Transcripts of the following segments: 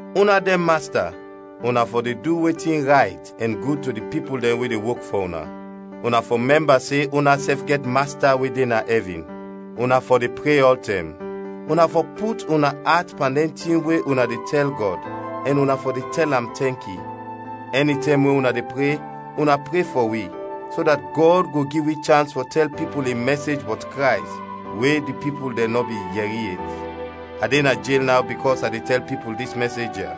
Una dɛn masta, una fɔ de du wetin rayt ɛn gud to di pipul dɛn we de wok fɔ una. Una fɔ mɛmba se unasɛf gɛt Masta we de na ɛvin. Una fɔ de pre ɔltɛm; una fɔ put una at pan dɛn tin we una de tɛl Gɔd ɛn una fɔ de tɛl am tɛnki. Ɛnitɛm we una de pre, una pre fɔ wi, so dat Gɔd go gi wi chans fɔ tɛl pipul in mɛsej bɔt Krays, we di pipul dɛn nɔ bin yɛri yet. A de na jel naw bikɔs a de tɛl pipul dis mɛsej ya.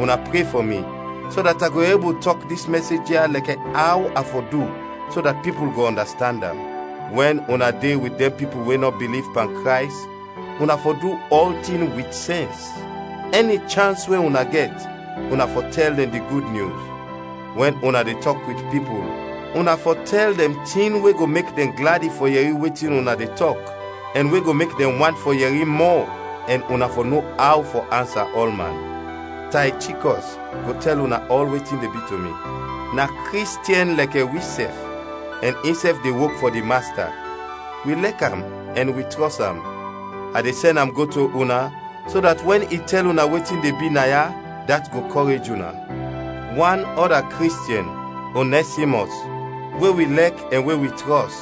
Una pre fɔ mi, so dat a go ebul tɔk dis mɛsej ya lɛkɛ aw a fɔ du so dat pipul go ɔndastand am. Wɛn una de wit dɛn pipul we nɔ biliv pan Krays, una fɔ du ɔltin wit sɛns. Ɛni chans we una gɛt, una fɔ tɛl dɛn di Gud Nyus. Wɛn una de tɔk wit pipul, una fɔ tɛl dɛn tin we go mek dɛn gladi fɔ yɛri wetin una de tɔk ɛn we go mek dɛn want fɔ yɛri mɔ, ɛn una fɔ no aw fɔ ansa ɔlman. Taychikɔs go tɛl una ɔl wetin de bi to mi; na Kristiɛn lɛkɛ wisɛf, ɛn insɛf de wok fɔ di Masta; wi lɛk am ɛn wi trɔs am. A de sɛn am go to una so dat wɛn i tɛl una wetin de bi na ya, dat go kɔrej una. Wan ɔda Kristiɛn, Onɛsimɔs, we wi lɛk ɛn we wi trɔs,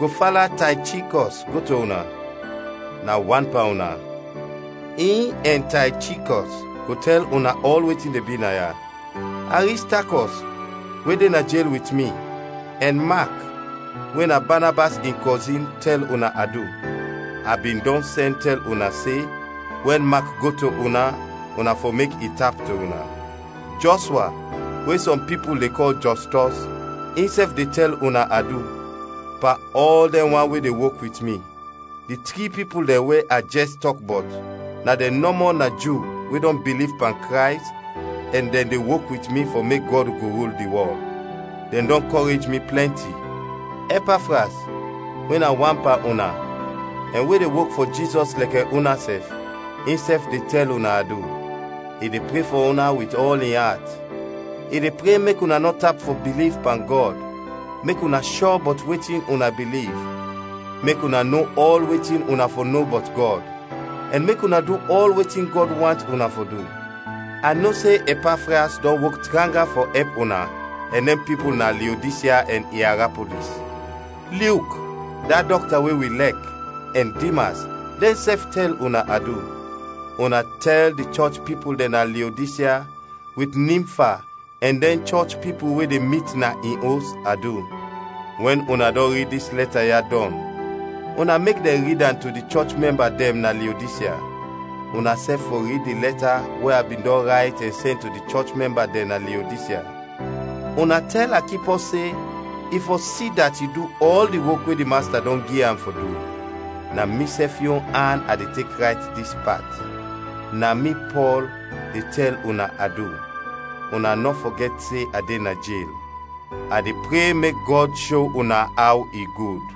go fala Taychikɔs go to una; na wan pan una. In ɛn Taychikɔs go tɛl una ɔl wetin de bi na ya. Aristakɔs, we de na jel wit mi, ɛn Mak, we na Banabas in kɔzin tɛl una adu. (A bin dɔn sɛn tɛl una se, wɛn Mak go to una, una fɔ mek i tap to una). Jɔshwa, we sɔm pipul de kɔl Jɔstɔs, insɛf de tɛl una adu. Pan ɔl dɛn wan we de wok wit mi, di tri pipul dɛn we a jɛs tɔk bɔt, na dɛn nɔmɔ na Ju we dɔn biliv pan Krays ɛn dɛn de wok wit mi fɔ mek Gɔd go rul di wɔl. Dɛn dɔn kɔrej mi plɛnti. Ɛpafras, we na wan pan una, ɛn we de wok fɔ Jizɔs lɛkɛ unasɛf, insɛf de tɛl una adu. I de pre fɔ una wit ɔl in at; i de pre mek una nɔ tap fɔ biliv pan Gɔd, mek una shɔ bɔt wetin una biliv, mek una no ɔl wetin una fɔ no bɔt Gɔd, ɛn mek una du ɔl wetin Gɔd want una fɔ du. A no se Ɛpafras dɔn wok tranga fɔ ɛp una ɛn dɛn pipul na Leodisya ɛn Iarapolis. Lyuk, da dɔkta we wi lɛk, ɛn Dimas, dɛnsɛf tɛl una adu. Una tɛl di chɔch pipul dɛn na Leodisya, wit Nimfa ɛn dɛn chɔch pipul we de mit na in os, adu. Wɛn una dɔn rid dis lɛta ya dɔn, una mek dɛn rid am to di chɔch mɛmba dɛn na Leodisya. Unasɛf fɔ rid di lɛta we a bin dɔn rayt ɛn sɛn to di chɔch mɛmba dɛn na Leodisya. Una tɛl Akipɔs se i fɔ si dat i du ɔl di wok we di Masta dɔn gi am fɔ du. Na misɛf yon an a de tek rayt dis pat: “Na mi, Pɔl, de tɛl una adu.” Una nɔ fɔgɛt se a de na jel! A de pre mek Gɔd sho una aw i gud.